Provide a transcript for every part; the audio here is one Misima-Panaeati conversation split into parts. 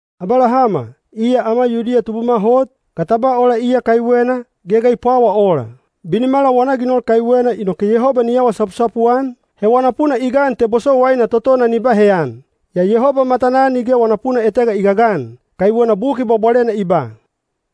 Abalahama, iya ama Yudiya tubuma hot, ga ta ba ola iya kaiwena, ge ga i pwawa ola? Binimala wana ginol kaiwena inoke Yehoba ni awa sapusapu-an, he wana puna i gan te bosowaina totona ni ba heyan. Yaa Yehoba matanaa nige wana puna etega i gagan. Kaiwena Buki Bwabwalena i ba,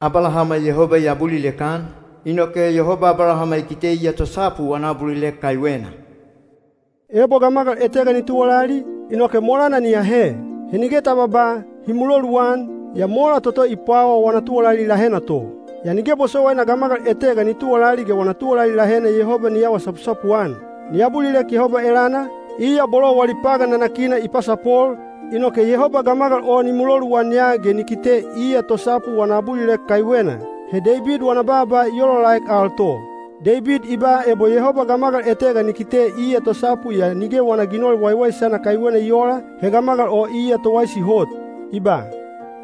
“Abalahama Yehoba i abulilek-an, inoke Yehoba Abalahama i kite iya tosapu wana abulilek kaiwena.” Ebo gamagal etega ni tuwalali, inoke molana ni ahe. He nige ta babaa, “Hi muloluan,” yaa mola toto i pwawa wana tuwalali lahena to. Yaa nige bosowaina gamagal etega ni tuwalali ge wana tuwalali lahena Yehoba ni awa sapusapu-an. Ni abulilek Yehoba elana, iya bolo wali pagan nanakina i pasapol, inoke Yehoba gamagal o ni muloluan ya ge ni kite iya tosapu wana abulilek kaiwena. He Deibid wana baaba i olaolaek al to. Deibid i ba ebo Yehoba gamagal etega ni kite iya tosapu yaa nige wana ginol waiwaisana kaiwena i oola, he gamagal o iya towaisi hot. I ba: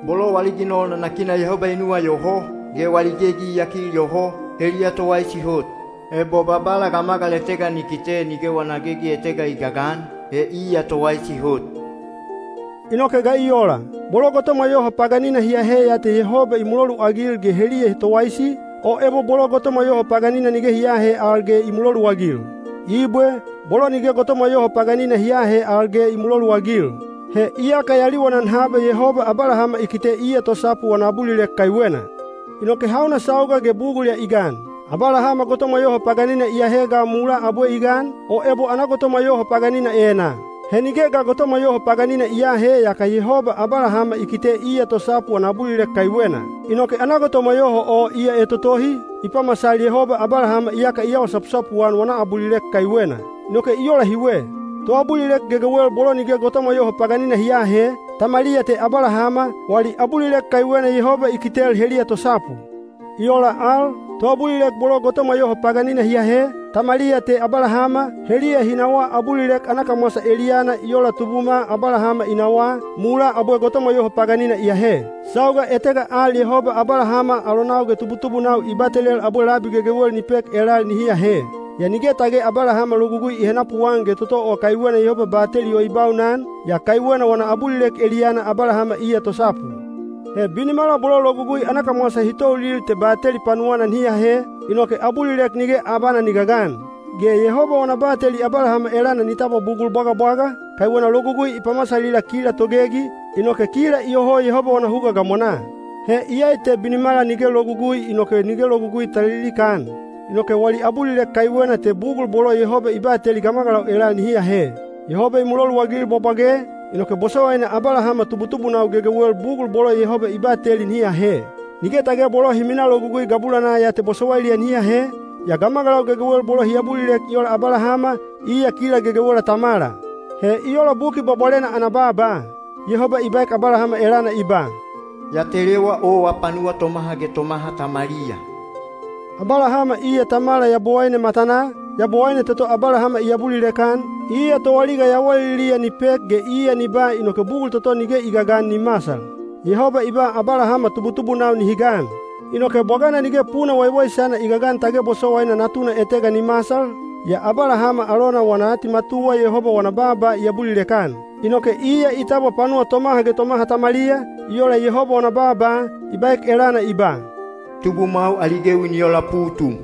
“Bolo wali ginol nanakina Yehoba i nuwayoho, ge wali gegi i yakil yoho, heliya towaisi hot. Ebo Babala gamagal etega ni kite nige wana gegi etega i gagan, he iya towaisi hot.” Inoke ga i ola? Bolo gotomwa yoho paganina hi ahe ya te Yehoba i muloluagil ge heliya towaisi, o ebo bolo gotomwa yoho paganina nige hi aahe al ge i muloluagil? Ibwe, bolo nige gotomwa yoho paganina hi aahe al ge i muloluagil. He iyaka ya liwanan haba Yehoba Abalahama i kite iya tosapu wana abulilek kaiwena. Inoke hauna sauga ge bugul ya i gan? Abalahama gotomwa yoho paganina i ahe ga mulaa abwe i gan, o ebo ana gotomwa yoho paganina enaa? He nige ga gotomwa yoho paganina i aahe yaka Yehoba Abalahama i kite iya tosapu wana abulilek kaiwena. Inoke ana gotomwa yoho o iya etotohi, i pamasal Yehoba Abalahama iyaka i awa sapusapu-an wana abulilek kaiwena. Inoke i ola hiwe. Toabulilek gegewel bolo nige gotomwa yoho paganina hi aahe, tamaliya te Abalahama, wali abulilek kaiwena Yehoba i kitel heliya tosapu. I ola al, toabulilek bolo gotomwa yoho paganina hi ahe, tamaliya te Abalahama, heliya hi nawaa abulilek ana kamwasa eliyana i ola tubuma Abalahama i nawaa, mulaa abwe gotomwa yoho paganina i ahe. Sauga etega al Yehoba Abalahama alonau ge tubutubunau i batelel abwe labi gegewel ni pek elal nihi ahe. Yaa nige tage Abalahama Logugui i henapuan ge toto o kaiwena Yehoba bateli o i baunan, yaa kaiwena wana abulilek eliyana Abalahama iya tosapu. He binimala bolo Logugui ana kamwasa hi toulil te bateli panuwana nihi ahe, inoke abulilek nige abana ni gagan. Ge Yehoba wana bateli Abalahama elana ni tabwa bugul bwagabwaga, kaiwena Logugui i pamasalila kila togegi, inoke kila iyoho Yehoba wana huga gamwanaa. He iyai te binimala nige Logugui inoke nige Logugui ta lilikaan. Inoke wali abulilek kaiwena te bugul bolo Yehoba i bateli gamagalau elal nihi ahe. Yehoba i muloluagil bwabwage, inoke bosowaina Abalahama tubutubunau gegewel bugul bolo Yehoba i bateli nihi ahe. Nige tage bolo hi minaa Logugui gabulanaa ya te bosowailiya nihi ahe, yaa gamagalau gegewel bolo hi abulilek i ola Abalahama, iya kila gegewela tamala. He i ola Buki Bwabwalena ana baaba. Yehoba i baek Abalahama elana i ba, “Ya telewa owa panuwa tomaha ge tomaha tamaliya.” Abalahama iya tamala Yabowaine matanaa, Yabowaine toto Abalahama i abulilek-an, iya toaliga yawaliliya ni pek ge iya ni ba inoke bugul toto nige i gagan ni masal. Yehoba i ba Abalahama tubutubunau nihi gan. Inoke bwagana nige puna waiwaisana i gagan tage bosowaina natuna etega ni masal, yaa Abalahama alona wana atimatuwa Yehoba wana baaba i abulilek-an. Inoke iya i tabwa panuwa tomaha ge tomaha tamaliya, i ola Yehoba wana baaba, i baek elana i ba, “Tubumwau ali gewi ni ola putum.”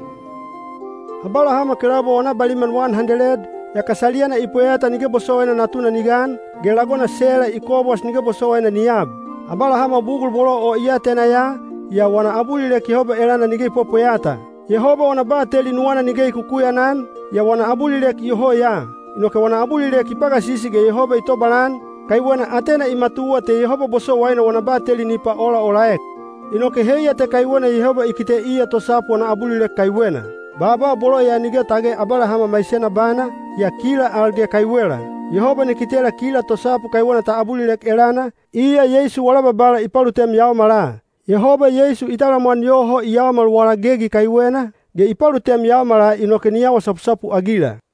Abalahama kelaubwa wana baliman wan handeled, yaka saliyana i pweyata nige bosowaina natuna ni gan, ge lagona Sela i kobwas nige bosowaina ni ab. Abalahama bugul bolo o i atena ya, yaa wana abulilek Yehoba elana nige i pwepweyata. Yehoba wana bateli nuwana nige i kukuyanan, yaa wana abulilek iyoho ya. Inoke wana abulilek i pagasisi ge Yehoba i tobalan, kaiwena atena i matuwa te Yehoba bosowaina wana bateli ni paolaolaek. Inoke heiya te kaiwena “Yehoba i kite iya tosapu wana abulilek kaiwena.” Baaba bolo ya nige tage Abalahama maisena bana, yaa kila al ge kaiwela. Yehoba ni kitela kila tosapu kaiwena ta abulilek elana, iya Yeisu wala Babala i palutem yaomala. Yehoba Yeisu i talamwan yoho i yaomal wala gegi kaiwena, ge i palutem yaomala inoke ni awa sapusapu-agila.